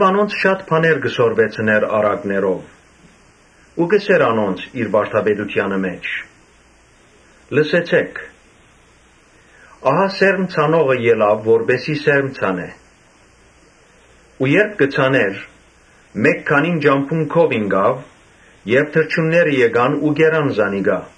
Անոնց շատ բաներ կը սորվեցնէր առակներով ու կ’ըսէր անոնց իր վարդապետութեանը մէջ. «Լսեցէ՛ք, ահա սերմ ցանողը ելաւ որպէս զի սերմ ցանէ։ Երբ կը ցանէր, մէկ քանին ճամբուն քով ինկան եւ թռչունները եկան ու կերան զանոնք։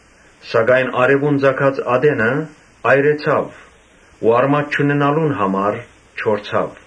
Սակայն արեւուն ծագած ատենը այրեցաւ ու արմատ չունենալուն համար չորցաւ։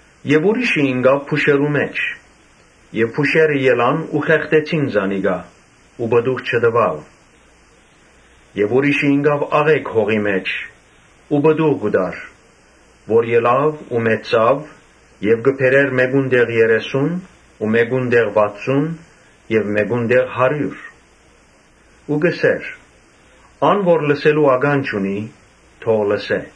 Ուրիշ մը ինկաւ փուշերու մէջ եւ փուշերը ելան ու խեղդեցին զանիկա ու պտուղ չտուաւ։ Ուրիշներ ինկան աղէկ հողի մէջ ու պտուղ տուին, որ ելան ու մեծցան եւ կը բերէին մէկուն տեղ երեսուն, մէկուն տեղ՝ վաթսուն, մէկուն տեղ՝ հարիւր»։ Ու կ’ըսէր. «Ան որ լսելու ականջ ունի՝ թող լսէ»։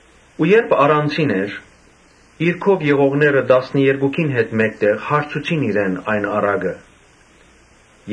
Երբ առանձինն էր, իր քով եղողները՝ տասներկուքին հետ մէկտեղ՝ հարցուցին իրեն այս առակին մասին։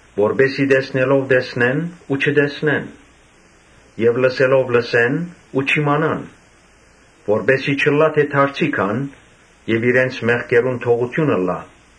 Որպէս զի տեսնելով տեսնեն՝ ու չտեսնեն եւ լսելով լսեն՝ ու չիմանան, որպէս զի չըլլայ թէ դարձի գան եւ իրենց մեղքերուն թողութիւն ըլլայ»։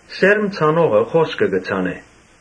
Սերմ ցանողը խօսքը կը ցանէ։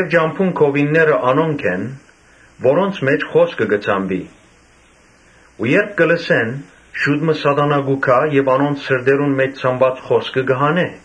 Ճամբուն քովինները անոնք են, որոնց մէջ խօսքը կը ցանուի ու երբ լսեն, շուտ մը Սատանան կու գայ եւ անոնց սրտերուն մէջ ցանուած խօսքը կը հանէ։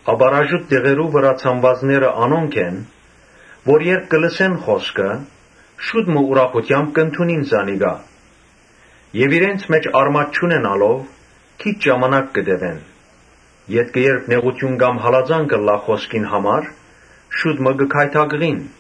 Ապառաժուտ տեղերու վրայ ցանուածները անոնք են, որ երբ լսեն խօսքը, շուտ մը ուրախութեամբ կ’ընդունին զանիկա, Բայց իրենց մէջ արմատ չունենալով՝ քիչ ժամանակ կը տեւեն, ետքը երբ նեղութիւն կամ հալածանք ըլլայ խօսքին համար, շուտ մը կը գայթակղին։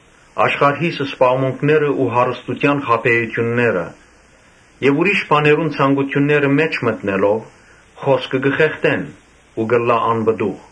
Աշխարհիս զբաղմունքներն ու հարստութեան խաբէութիւնները եւ ուրիշ բաներու ցանկութիւններ մէջ մտնելով, խօսքը կը խեղդեն ու կ’ըլլան անպտուղ։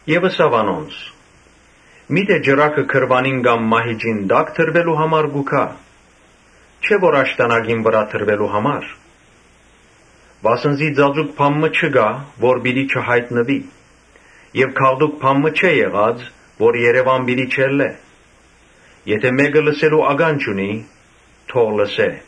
Ապա ըսաւ անոնց. «Միթէ ճրագը գրուանին կամ մահիճին տա՞կ դրուելու համար կու գայ, չէ՞ որ աշտանակին վրայ դրուելու համար։ Վասն զի ծածուկ բան մը չկայ, որ պիտի չյայտնուի. եւ գաղտուկ բան մը չէ եղած, որ երեւան չելլէ։ Եթէ մէկը լսելու ականջ ունի, թող լսէ»։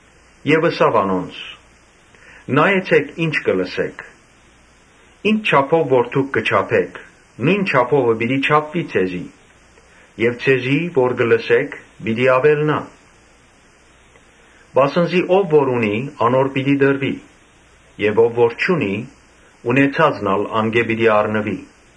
Յետոյ ըսաւ անոնց. «Նայեցէք, ի՞նչ կը լսէք. ի՛նչ չափով որ դուք կը չափէք, նոյն չափովը պիտի չափուի ձեզի եւ ձեզի որ կը լսէք, պիտի աւելնայ։ Վասն զի ո՛վ որ ունի անոր պիտի տրուի. եւ ո՛վ որ չունի, ունեցածն ալ անկէ պիտի առնուի»։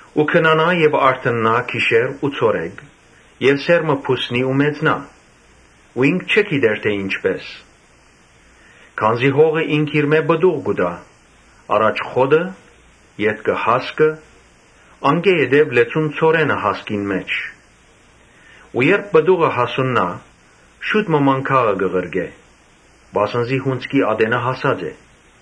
Ու քնանայ եւ արթննայ գիշեր ու ցորեկ եւ սերմը բուսնի ու մեծնայ ու ինք չի գիտեր թէ ի՛նչպէս։ Քանզի հողը ինքնիրմէ պտուղ կու տայ. առաջ խոտը, ետքը հասկը, անկէ ետք լեցուն ցորենը հասկին մէջ։ Երբ պտուղը հասուննայ մանգաղը գործի կ’սկսի վասն զի հունձքի ատենը հասած է»։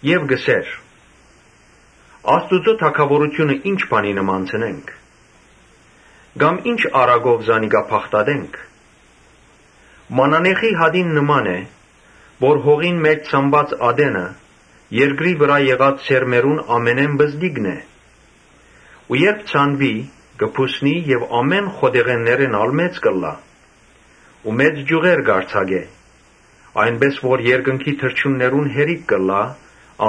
Ապա կ’ըսէր. «Աստուծոյ թագաւորութիւնը ի՞նչ բանի նմանցնենք կամ ի՞նչ առակով զանիկա բացատրենք։ Մանանեխի հատին նման է, որ հողին մէջ ցանուած ատենը՝ երկրի վրայ եղած սերմերուն ամենէն պզտիկն է, Բայց երբ ցանուի, բուսնի, բոլոր ծառերէն ալ մեծ կ’ըլլայ ու մեծ ճիւղեր կ’արձակէ, այնպէս որ երկնքի թռչուններուն կը բաւէ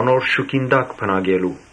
անոր շուքին տակ բնակելու»։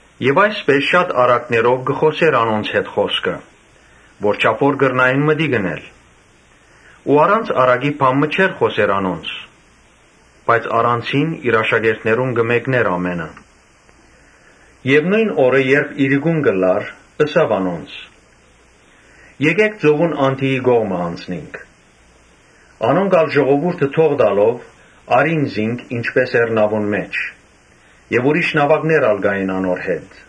Այսպէս շատ առակներով կը խօսէր անոնց, որչափ որ կրնային մտիկ ընել։ Առանց առակի բան մը չէր խօսեր անոնց, բայց առանձինն աշակերտներուն կը մեկնէր բոլորը։ Նոյն օրը երբ իրիկուն եղաւ, ըսաւ աշակերտներուն. «Եկէք ծովուն անդիի կողմը անցնինք»։ Անոնք ալ ժողովուրդը արձակելով՝ առին զինք, որ արդէն նաւուն մէջ էր. եւ ուրիշ նաւակներ ալ կային անոր հետ։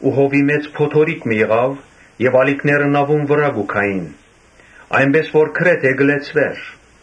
Մեծ փոթորիկ մը ելաւ եւ ալիքները նաւուն վրայ կու գային, այնպէս որ գրեթէ նաւը կը լեցուէր։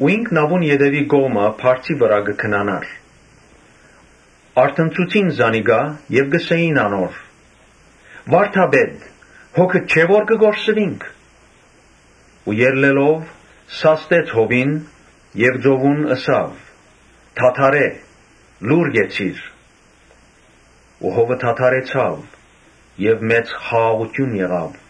Ինք նաւուն ետեւի կողմը բարձի վրայ կը քնանար. արթնցուցին զանիկա եւ ըսին անոր. «Վա՛րդապետ, հոգդ չէ՞ որ կը կորսուինք»։ Ու ելլելով՝ սաստեց հովին եւ ծովուն ըսաւ. «Դադարէ՛, լո՛ւռ կեցիր»։ Հովը դադարեցաւ եւ մեծ խաղաղութիւն եղաւ։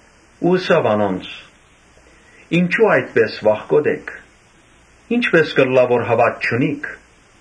Ըսաւ անոնց. «Ինչո՞ւ այդպէս վախկոտ էք, ի՞նչպէս կ’ըլլայ որ հաւատք չունիք»։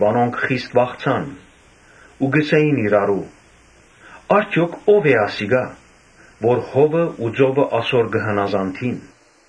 Անոնք խիստ վախցան ու ըսին իրարու. «Արդեօք ո՞վ է ասիկա, որ հովն ու ծովը ասոր կը հնազանդին»։